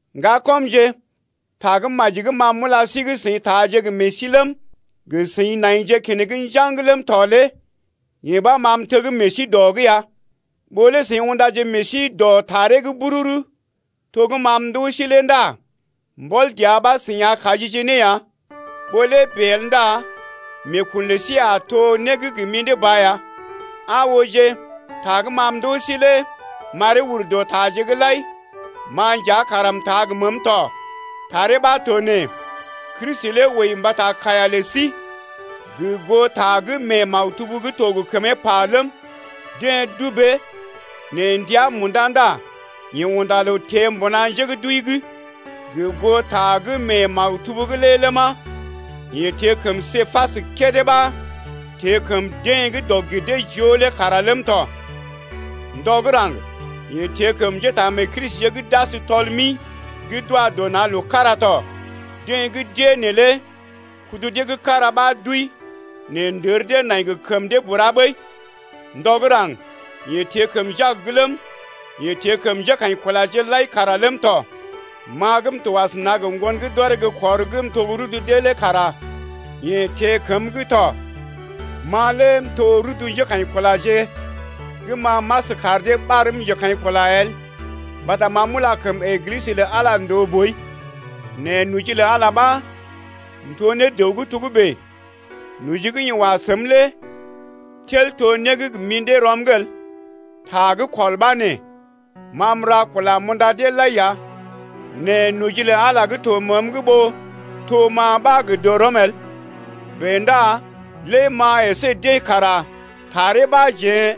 Ŋgakɔmje, Tagə́maji gə́ ma m’ula sí gə́ seḭ taaje gə meḛ sí ləm, gə seḭ naije keneŋ njaŋg ləm tɔ lé yee ɓa ma m’teg meḛ sí dɔ’g ya. Ɓó lé seḭ undaje meḛ sí dɔ taree’g bururu to gə́ ma m’ndoo sí lé ndá mbɔl dəa ɓa seḭ a kajije ne ya. Ɓó lé bèe el ndá meekun lə sí a to né gə́ gə mḭdé ba ya. Aa ooje, ta gə́ ma m’ndoo sí lé m’aree ur dɔ taje’g lai, ma nja kara m’taa gə məəm tɔ. Taree ɓa to nee: Kristi lé wəi mbata kaiya lə sí gə goo ta gə́ mee maktub gə́ to gə kəmee pa ləm, deḛ dubee nɛ ndəa munda ndá yeḛ unda loo teḛ mbuna njé gə́ d’wəi’g gə goo ta gə́ mee maktub’g lé ləma, yeḛ teḛ kəm Képas kédé, ɓa teḛ kəm deḛ gə́ dɔg-gir-dee-joo’g lé kara ləm tɔ. Ndɔ gə́ raŋg yeḛ teḛ kəm njétaamee-Kristije gə́ d’as tɔl-mi gə́ d’wa dɔ na̰ loo kára tɔ, deḛ gə́ d’ée neelé kudu dee gə́ kára ɓa d’wəi nɛ ndər dee nai gə kəmə lə dee bura ɓəi. Ndɔ gə́ raŋg yeḛ teḛ kəm Jak ləm, yeḛ teḛ kəm njékaḭkulaje lai kara ləm tɔ. Ma gə́ m’to asəna gə ŋgon gə́ d’ɔree gə́ kɔr gə́ m’to gə́ rudu dee lé kara yeḛ teḛ kəm tɔ. Ma lé m’to rudu njékaḭkulaje gə́ ma m’as kar dee ɓarm njekaḭkula el mbata ma m’ula kəm Eglisə lə Ala ndòo boi. Nɛ noji lə Ala ɓa m’to ne dəw gə́ togə́bè, noji gə́ yeḛ wa səm lé tel to né gə́ gə mḭdé rɔm’g el. Ta gə́ kɔl ɓa nee: Ma m’ra kula m’unda deḛ lai ya, nɛ noji lə Ala gə́ to məəm’g ɓó to ma ɓa gə dɔrɔm el. Bèe ndá lé ma əsé deḛ kara taree ɓa jeḛ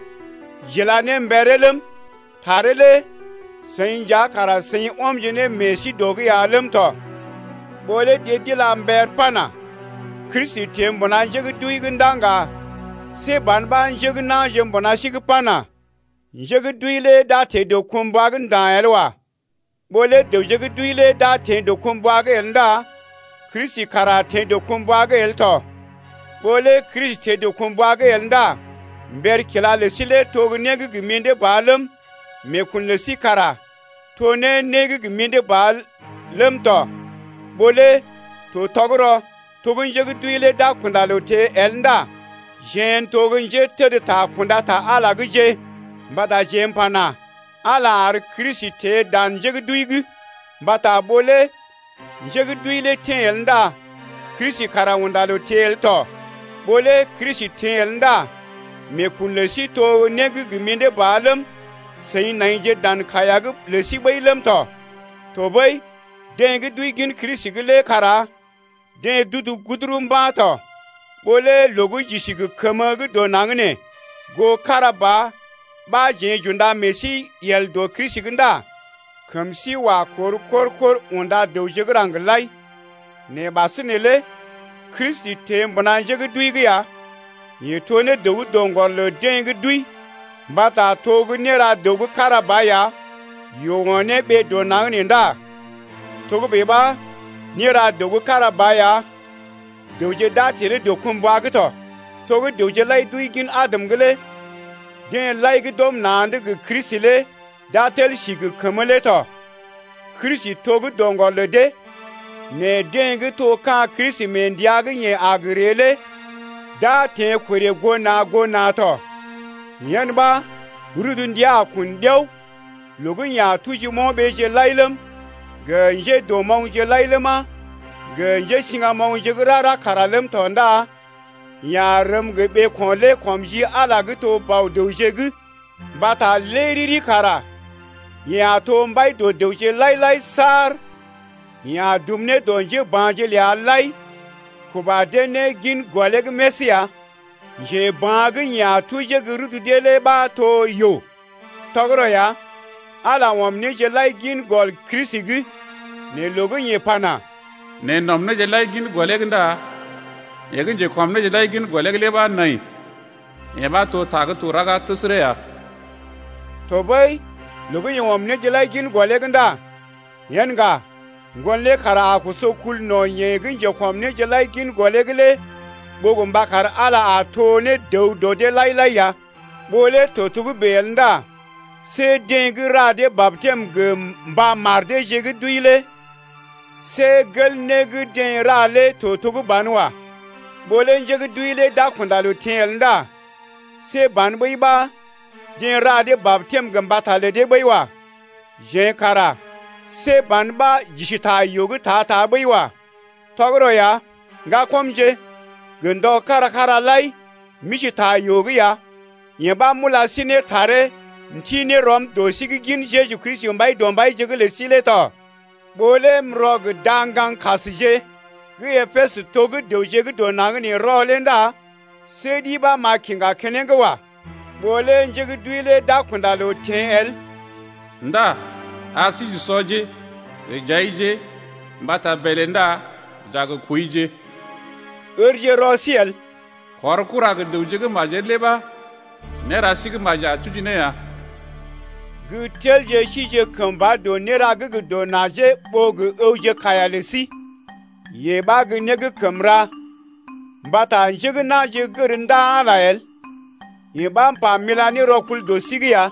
j’ila ne mberee ləm, taree lé seḭ nja kara seḭ ɔmje ne meḛ sí dɔ’g ya ləm tɔ. Ɓó lé deḛ d’ila mber pana: Kristi teḛ mbuna njé gə́ d’wəi’g ndá ŋga, see ban ɓa njé gə́ na̰je mbuna sí’g pana: Njé gə́ d’wəi lé d’a teḛ dɔkumbwa’g nda̰ el wa. Ɓó lé dəwje gə́ d’wəi lé d’a teḛ dɔkumbwa’g el ndá Kristi kara teḛ dɔkumbwa’g el tɔ. Ɓó lé Kristi teḛ dɔkumbwa’g el ndá mber kila lə sí lé to né gə́ gə mḭdé ba ləm, meekun lə sí kara to ne né gə́ gə mḭdé ba ləm tɔ. Ɓó lé to tɔgərɔ to gə́ nje gə́ d’wəi lé d’a kunda loo teḛ el ndá jeḛ n’toje gə́ njétədta kunda ta Ala’gje, mbata jeḛ m’pana: Ala lé ar Kristi teḛ dan njé gə́ d’wəi’g. Mbata ɓó lé njé gə́ d’wəi lé teḛ el ndá Kristi kara unda loo teḛ el tɔ. Ɓó lé Kristi teḛ el ndá meekun lə sí to gə́ mḭdé ba ləm, seḭje naije dan kaiya’g lə sí ɓəi ləm tɔ. Tɔɓəi deḛ gə́ d’wəi gin Kristi’g lé kara deḛ d’udu guduru mba̰ tɔ. Ɓó lé loo gə́ j’isi gə kəmə dɔ naŋg nee goo kára ba ɓa jeḛ j’unda meḛ sí yel dɔ Kristi’g ndá kəm sí wa kor kor-kor unda dəwje gə́ raŋg lai. Nɛ ɓasinè lé Kristi teḛ mbuna njé gə́ d’wəi’g ya, yeḛ to ne dəw gə́ doŋgɔr lə deḛ gə́ d’wəi. Mbata to gə́ néra dəw gə́ kára ba ya, yoo o̰ ne ɓee dɔ naŋg nee ndá togə́bè ɓa néra dəw gə́ kára ba ya dəwje d’a teḛ ne dɔkumbwa’g tɔ. To gə́ dəwje lai d’wəi gin Adam’g lé deḛ lai gə́ d’ɔm na̰’d gə Kristi lé d’a tel si gə kəmə lé tɔ. Kristi to gə́ doŋgɔr lə dee, nɛ deḛ gə́ to ka̰ Kristi mee ndəa gə́ yeḛ a gə ree lé d’a teḛ korè goo na̰ goo na̰ tɔ. Yen ɓa rudu ndəa a kun ɗiao loo gə́ yeḛ a tuji mo̰ɓeeje lai ləm, gə njédɔmoŋgje lai ləma, gə njésiŋgamoŋje gə́ rara kara ləm tɔ ndá yeḛ a rəm gə ɓeeko̰ lé kɔm ji Ala gə́ to Bɔ-dəwje’g. Mbata lé riri kara yeḛ a to mbai dɔ dəwje lai-lai saar yeḛ a dum ne dɔ njéba̰je’g ləa lai kuba dee ne gin gɔlee’g més ya. Njeba̰ gə́ yeḛ a tuji gə́ rudu dee lé ɓa to yoo. Tɔgərɔ ya, Ala ɔm néje lai gin gɔl Kristi’g. Nɛ loo gə́ yeḛ pana: Neḛ n’ɔm néje lai gin gɔlee’g ndá yeḛ gə́ njekɔm néje lai gin gɔlee’g lé ɓa nai, yee ɓa to ta gə́ to raga təsərə ya. Tɔɓəi loo gə́ yeḛ ɔm néje lai gin gɔlee’g ndá yen ŋga Ŋgon lé kara a koso kul no̰ yeḛ gə́ njekɔm néje lai gin gɔlee’g lé ɓó gə mba kar Ala a to ne dəw dɔ dee lai-lai ya. Ɓó lé to togə́bè el ndá see deḛ gə́ ra dee batɛm gə mba mar deeje gə́ d’wəi lé see gel né gə́ deḛ ra lé to to gə́ banwa. Ɓó lé njé gə́ d’wəi lé d’a kunda loo teḛ el ndá see ban ɓəi ɓa deḛ ra dee batɛm gə mbata lə dee ɓəi wa. Jeḛ kara see ban ɓa j’isi ta yoo’g ta-ta ɓəi wa. Tɔgərɔ ya, ŋgakɔmje, gə ndɔje kára-kára lai m’isi ta yoo’g ya, yee ɓa m’ula sí ne taree m’ti ne rɔm dɔ sí’g gin Jeju Kristi Mbaidɔmbaije’g lə sí lé tɔ. Ɓó lé m’rɔ gə da-ŋgaŋkasje gə́ Epesə to gə́ dəwje gə́ dɔ naŋg nee rɔ lé ndá see ɗi ɓa m’a kiŋga keneŋ wa. Ɓó lé njé gə́ d’wəi lé d’a gə kunda loo teḛ el Ndá ar sí j’usɔje gə j’aije Mbata bèlè ndá j’a gə kwəije. Ǝrje rɔ sí el: kɔr kura gə dəwje gə́ majel lé ɓa néra sí gə́ maji a tuji ne ya. Gə́ telje sije kəmba dɔ néra gə́ gə dɔ najee ɓó əwje kaiya lə sí, yee ɓa gə́ né gə́ kəm ra, mbata njé gə́ na̰je gər ndaa Ala el, yee ɓa m’pa m’ila ne rɔkul dɔ sí’g ya.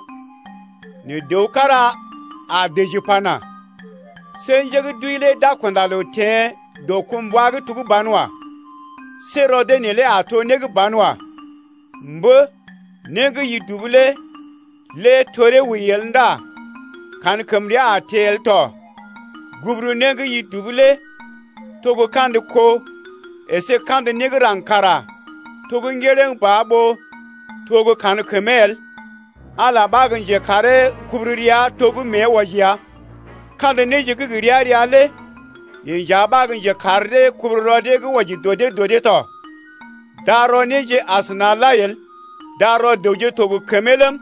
Nɛ dəw kára a dəji pana: See njé gə́ d’wəi lé d’a kunda loo teḛ dɔkumbwa’g to gə́ banwa. See rɔ dee neelé a to né gə́ banwa. Mbə, né gə́ i dubu lé lé toree wəi el ndá kankəmrea a teḛ el tɔ. Guburu né gə́ i dubu lé to gə́ kandə kó əsé kandə né gə́ raŋg kara to gə́ ŋgerəŋ ba ɓó to gə́ kankəmee el. Ala ɓa gə́ njekaree kubururea to gə́ mée wɔji ya, kandə néje gə́ gə ria-ria lé yeḛ nja ɓa gə́ njekar dee kubururɔ dee gə́ wɔji dɔ dee dɔ dee tɔ. Darɔ néje asəna lai el, darɔ dəwje to gə kəmee ləm,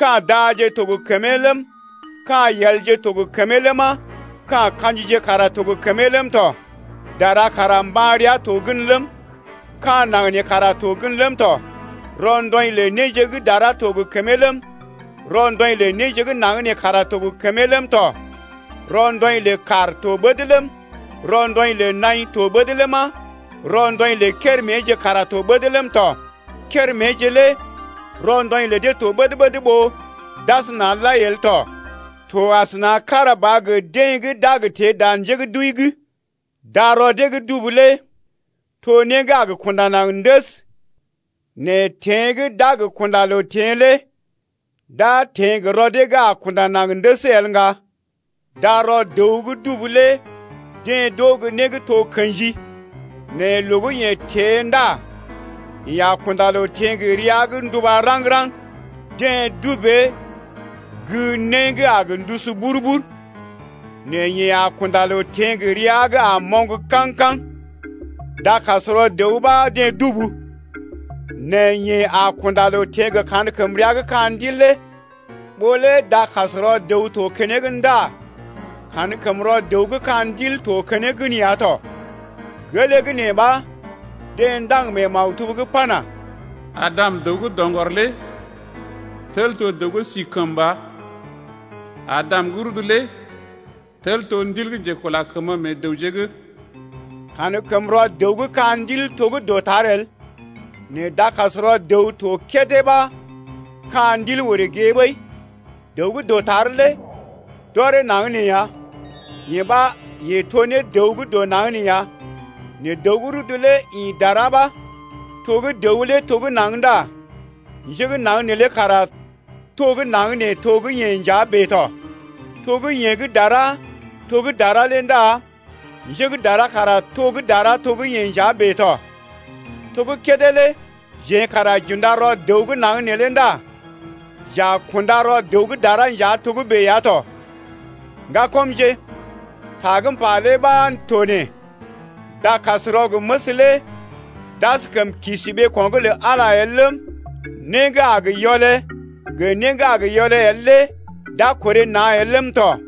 ka̰ daje to gə kəmee ləm, ka̰ yelje to gə kəmee ləma, ka̰ ka̰jije kara to gə kəmee ləm tɔ. Dara kara mban rəa to gən ləm, ka̰ naŋg kara to gən ləm tɔ. Rɔndɔḭ lə néje gə́ dara to gə kəmee ləm, rɔndɔḭ lə néje gə́ naŋg nee kara to gə kəmee ləm tɔ. Rɔndɔḭ lə kàr to ɓəd ləm, rɔndɔḭ lə naḭ to ɓəd ləma, rɔndɔḭ lə kéréméje kara to ɓəd ləm tɔ. Kéréméje lé rɔndɔḭ lə dee to ɓəd-ɓəd ɓó d’asəna lai el tɔ. To kára ba asəna gə deḛ gə́ d’a gə teḛ dan njé gə́ d’wəi’g, darɔ dee gə́ dubu lé to né gə́ a gə kunda naŋg ndəs, nɛ teḛ gə́ d’a gə d’a kunda loo teḛ lé d’a teḛ gə rɔ dee gə́ a gə kunda naŋg ndəs el ŋga. Darɔ dəw gə́ dubu lé deḛ d’oo gə́ né gə́ to kḛji nɛ loo gə́ yeḛ teḛ ndá yeḛ a kunda loo teḛ gə rəa gə́ nduba raŋg-raŋg. Deḛ dubee gə́ né gə́ a gə ndusu bur-bur, nɛ yeḛ a kunda loo teḛ gə rəa gə́ a moŋg kaŋ-kaŋ. Dakasrɔ dəw ɓa deḛ dubu, nɛ yeḛ a kunda loo teḛ gə kankəmrea gə́ ka̰ ndil lé. Ɓó lé dakasrɔ dəw to keneŋ ndá kankəmrɔ dəw gə́ ka̰ ndil to keneŋ gən ya tɔ. Gelee gə́ nee ɓa deḛ ndaŋg mee maktub’g pana: Adam, dəw gə́ doŋgɔr lé tel to dəw gə́ si kəmba. Adam gə́ rudu lé tel to ndil gə́ njekula kəmə meḛ dəwje’g. Ka̰kəmrɔ dəw gə́ ka̰ ndil to gə́ dɔtar el nɛ dakasrɔ dəw to kédé ɓa ka̰ ndil orè gée ɓəi. Dəw gə́ dɔtar lé d’ɔree naŋg nee ya, yee ɓa yeḛ to ne dəw gə́ dɔ naŋg nee ya: nɛ dəw gə́ rudu lé ḭ dara ɓa. To gə́ dəw lé to gə́ naŋg ndá njé gə́ naŋg neelé kara to gə́ naŋg nee to gə́ yeḛ nja bèe tɔ. To gə́ yeḛ gə́ dara to gə́ dara lé ndá njé gə́ dara kara to gə́ dara to gə́ yeḛ nja bèe tɔ. To gə́ kédé lé jeḛ kara j’unda rɔ dəw gə́ naŋg neelé ndá j’a kunda rɔ dəw gə́ dara lé nja togə́bè ya tɔ. Ŋgakɔmje, ta gə́ m’pa lé ɓa to nee: Dakasrɔ gə məs lé d’askəm kisi ɓeeko̰’g lə Ala el ləm, né gə́ a gə yɔlé gə né gə́ a gə yɔlé el lé d’a korè na̰ el ləm tɔ.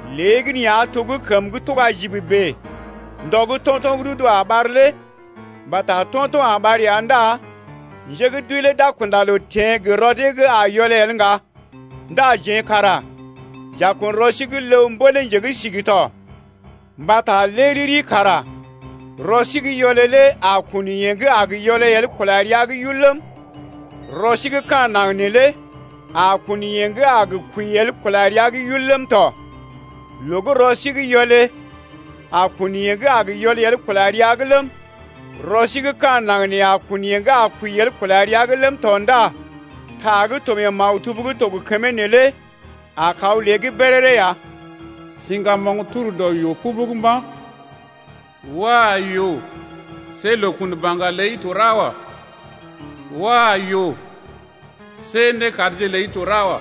léegəneeya to gə́ kəm gə́ tuga jib bèe ndɔ gə́ to̰to̰ gə́ rudu a ɓar lé. Mbata to̰to̰ a ɓar ya ndá njé gə́ d’wəi lé d’a kunda loo teḛ gə rɔ dee gə́ a gə yɔlé el ŋga ndá jeḛ kara j’a kun rɔ sí gə́ ləw mbél ne nje gə́ sigi tɔ. Mbata lé riri kara rɔ sí gə́ yɔlé lé a kun yeḛ gə́ a gə yɔlé el kula rəa’g yul ləm, rɔ sí gə́ ka̰ naŋg neelé a kun yeḛ gə́ a gə kwəi el kula rəa’g yul ləm tɔ. Loo gə́ rɔ sí gə́ yɔlé a kun yeḛ gə́ a gə yɔlé el kula rəa’g ləm, rɔ sí gə́ ka̰ naŋg nee a kun yeḛ gə́ a kwəi el kula rəa’g ləm tɔ ndá ta gə́ to mee maktub gə́ to gə kəmee neelé a kaw lée’g béréré ya: Siŋgamoŋ tur dɔ yoo pubug mba̰. Wah! yoo, see loo kun baŋga ləi to ra wa. Wah! yoo, see nékadje ləi to ra wa.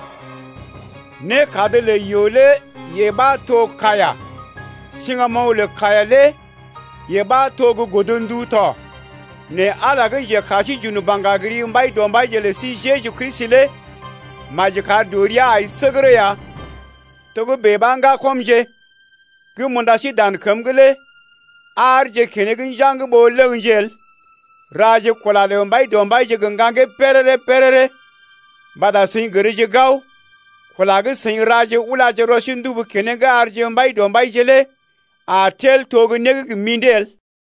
Nékad lə yoo lé yee ɓa to kaiya, siŋgamoŋ lə kaiya lé yee ɓa to gə́ godndu tɔ. Nɛ Ala lé gə́ njekar sí j’un baŋga gə ri Mbaidɔmbaije lə sí Jeju Kristi lé maji kar dɔ ria ai səgərə ya. Togə́bè ɓa, ŋgakɔmje gə́ m’unda sí dan kəm’g lé aarje kenḛg njaŋg ɓó ləŋje el. Raje kula lə Mbaidɔmbaije gə ŋgaŋgee béréré-béréré mbata seḭ gərje gao, kula gə́ seḭ raje ulaje rɔ sí ndubu keneŋ arje Mbaidɔmbaije lé a tel to né gə́ gə mḭdé el.